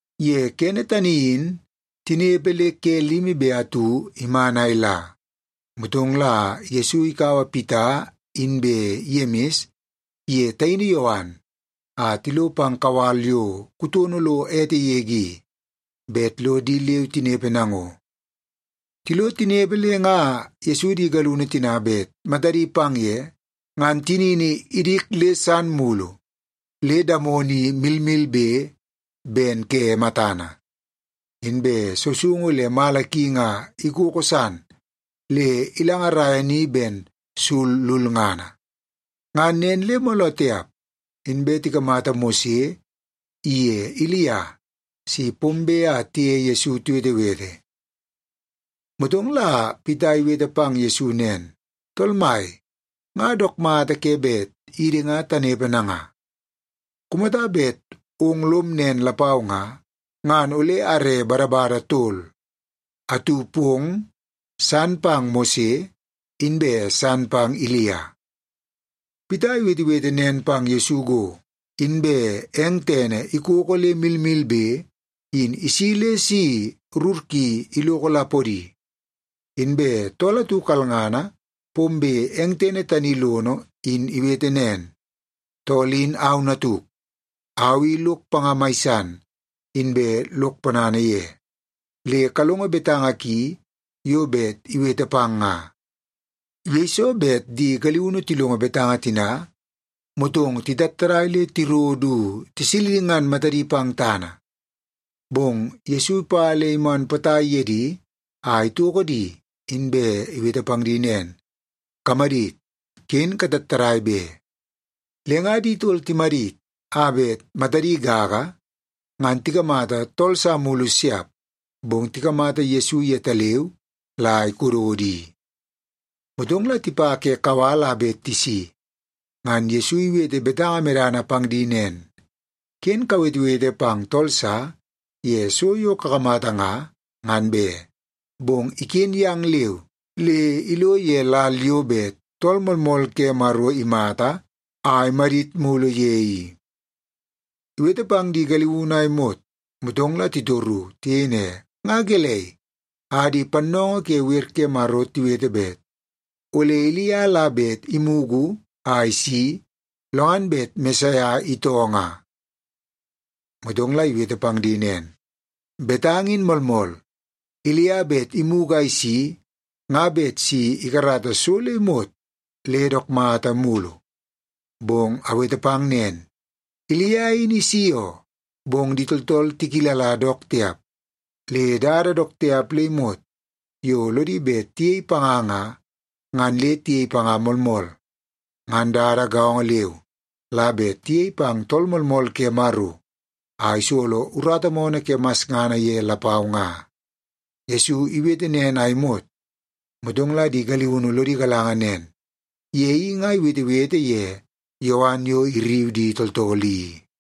Ye kene tani in, tinepe le ke limi be atu iman a ila, motong la Yesu ikaua Pita inbe Yemis iye taini Yowan a tilo pang kawal yo kutono lo ete yege i, bet lo di leu tinepe nango. Tilo tinepe le nga Yesu di galiunu tina bet matadi pang ye, ngan tinini idik le san mulu le damono i milmilbe ben ke matana, inbe sousoungu le mala ki nga ikoko san le ilangaraia ni ben sul lulngana. Ngan nen le mooloo tiap, inbe tikamata Mose iye Ilia si pombe a tiye Yesu tiwetewete. Motong la Pita iwete pang Yesu nen, “Tool Mai, nga dook mata ke bet idi nga tanepe nanga. Kumata bet ong lom nen lapau nga, ngan ole are badabada tol; atu pong, san pang Mose, inbe san pang Ilia.” Pita iwetewete nen pang Yesu go, inbe eng tene ikoko le milmilbe, in isi le si rur ki iloko la podi. Inbe tool atu kalngana pombe eng tene tani lono in iwete nen, “Tool in au natuk. Au i lok panga mai san, inbe lok ponana ye. Le kalongo betanga ki yo bet iwete pang nga!” Yeiso bet di galiunu tilongo betanga tina, motong titattadai le tiro du tisilingan matadi pang tana. Bong Yesu ipa le iman potai ye di a itoko di, inbe iwete pang di nen, “Kamadit! Ken katattadai be!” Le nga di tol timadit a bet matadi gaga, ngan tikamata tool sa mulu siap, bong tikamata Yesu yetaleu la ikododo i. Motong la tipa ke kawal a bet tisi, ngan Yesu iwete betanga medana pang di nen, “Ken kawetewete pang tool sa ye so yo kakamata nga, ngan be. Bong iken yang leu le ilo ye lal yo bet Tool Moolmool ke Maro imata a imadit mulu ye i.” Iwete pang di galiunu a imot, motong la titoru. Tiyei ne, “Nga gelei a di pannoongoo ke wer ke Maro tiwete bet ole Ilia la bet imugu a isi, lo ngan bet Mesaia itoo nga?” Motong la iwete pang di nen, “Betanga in moolmool. Ilia bet imugu a isi nga bet si ikarata so le imot le dook mata mulu. Bong awete pang nen, Ilia in isi oo. Bong di tooltool tikilala dook tiap, le dada dook tiap le imot yo lodi bet tiyei panga nga, ngan le tiyei panga moolmool. Ngan dada gaongo leu la bet tiyei pang Tool Moolmool ke Maro a isolo urata moonoo ke masngana ye lapau nga.” Yesu iwete nen a imot, motong la di galiunu lodi galanga nen, ye i nga iwetewete ye Yowan yo irriu di tooltool i.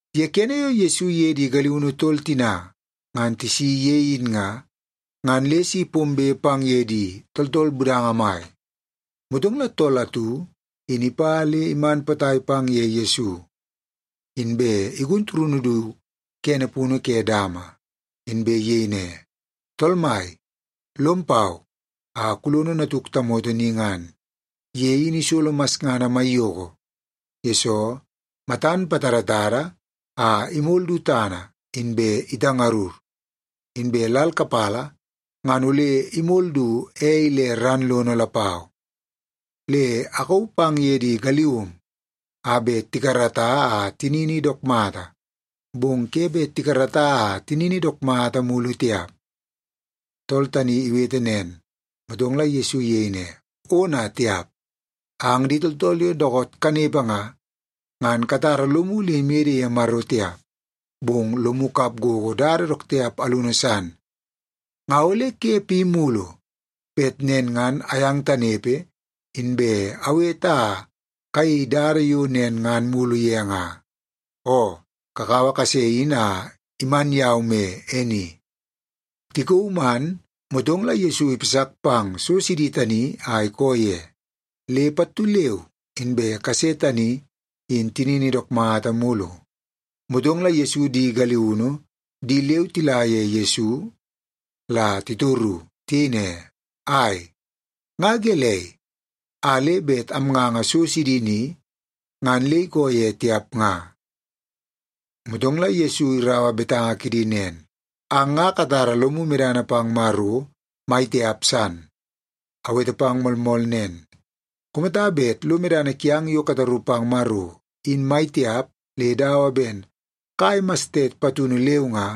Ye kene yo Yesu iye di galiunu tol tina ngan tisi ye in nga, ngan le si pombe pang ye di tooltool budanga mai. Motong la tool atu in ipa le iman potai pang ye Yesu, inbe igun turunu du kene punu ke dama. Inbe iyei ne, “Tool Mai, lom pau a kulono natuk tamoto ni ngan. Ye in isolo masngana maiyoko, yesoo matan patadatada a imol du tana, inbe itangurngur. Inbe lal kapala ngan ole imol du ei le ran lono lapau. Le akauu pang ye di galium a bet tikarata a tinini dook mata, bong ke bet tikarata a tinini dook mata mulu tiap.” Tool tani iwete nen, motong la Yesu iyei ne, “Ona tiap! Ang di tooltool yo dookoot kanepe nga, ngan katara lomu le imede ye Maro tiap, bong lomu kap gogo dada dook tiap alunu san. Nga ole ke pi mulu bet nen ngan ayang tanepe, inbe awete a kayei dada yo nen ngan mulu ye nga? Oo, kakaua kase in a iman yau me e ni.” Tikauu man, motong la Yesu ipasak pang so sidi tani a ikoo ye, le pattu leu inbe kase tani in tinini dook mata mulu. Motong la Yesu di galiunu di leu tila ye Yesu la titoru. Tiyei ne, “Ai, nga gelei, a le bet amnganga so sidi ni, ngan le ikoo ye tiap nga?” Motong la Yesu iraua betanga kidi nen, “Ang nga katara lomu medana pang Maro mai tiap san. Awete pang moolmool nen, kumata bet lo medana kiang yo kataru pang Maro, in mai tiap le dawa ben kai mastet patunu leu nga,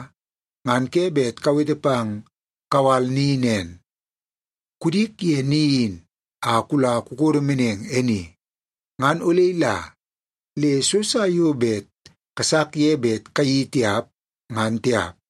ngan ke bet kawete pang kawal ni nen, ‘Kudik ye ni in, a la kukodo meneng e ni’, ngan ole ila. Le so sa yo bet kasak ye bet kayeii tiap, ngan tiap.”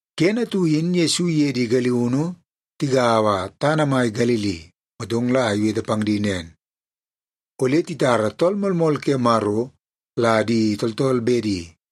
Kene atu in Yesu iye di galiunu tigaua tana mai Galili, motong la iwete pang di nen, “Ole titara Tool Moolmool ke Maro la di tooltool bedi,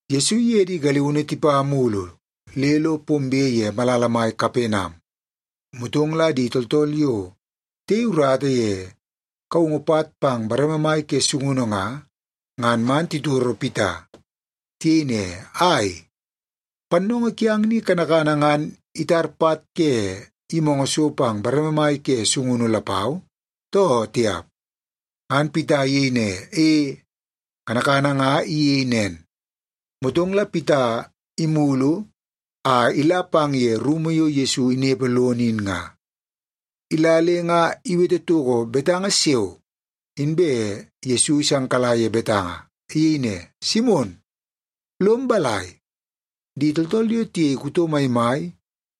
Yesu iye di galiunu tipa mulu le lo pombe ye malala mai Kapenam, motong la di tooltool yo tiyei urata ye kaungu pat pang bareme mai ke sungunu nga, ngan man titoro Pita. Tiyei ne, “Ai, pannoongoo kiang ni kanakana ngan itar pat ke yimoongoo so pang bareme mai ke sungunu lapau, too tiap?” Ngan Pita iyei ne, “E, kanakana nga iyei nen.” Motong la Pita imulu a ila pang ye rumu yo Yesu inepe lono i nga. Ila le nga iwete toko betanga siao, inbe Yesu isangkala ye betanga. Iyei ne, “Simon, lom balai? Di tooltool yo tiyei kuto maimai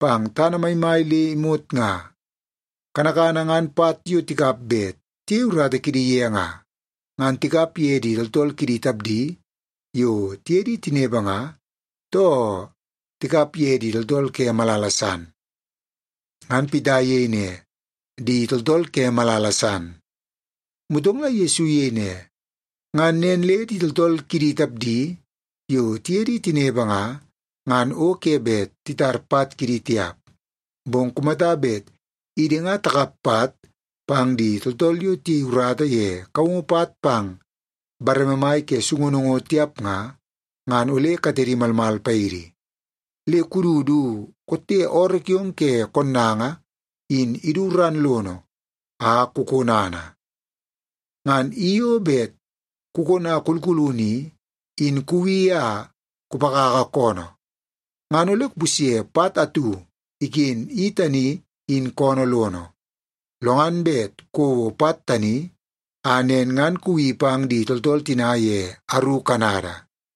pang tana maimai le imot nga, kanakana ngan pat yo tikap bet tiyei urata kidi ye nga, ngan tikap ye di tooltool kidi tapdi yo tiye di tinepe nga, too tikap ye di tooltool ke malala san?” Ngan Pita iyei ne, “Di tooltool ke malala san.” Motong la Yesu iyei ne, “Ngan nen le di tooltool kidi tapdi yo tiye di tinepe nga, ngan o ke bet titar pat kidi tiap. Bong kumata bet idi nga takap pat pang di tooltool yo tiyei urata ye kaungu pat pang bareme mai ke sungunu ngo tiap nga, ngan ole katedi malmal paidi. Le kudu du kotte ooroo kiong ke konnanga in idu ran lono a kukonana. Ngan i yo bet kukona kulkulunu i, in kuwi a kupakaka koonoo, ngan ole kupusye pat atu iken i tani in koonoo lono. Lo ngan bet kouo pat tani, a nen ngan kuwi pang di tooltool tina ye aru kanada.”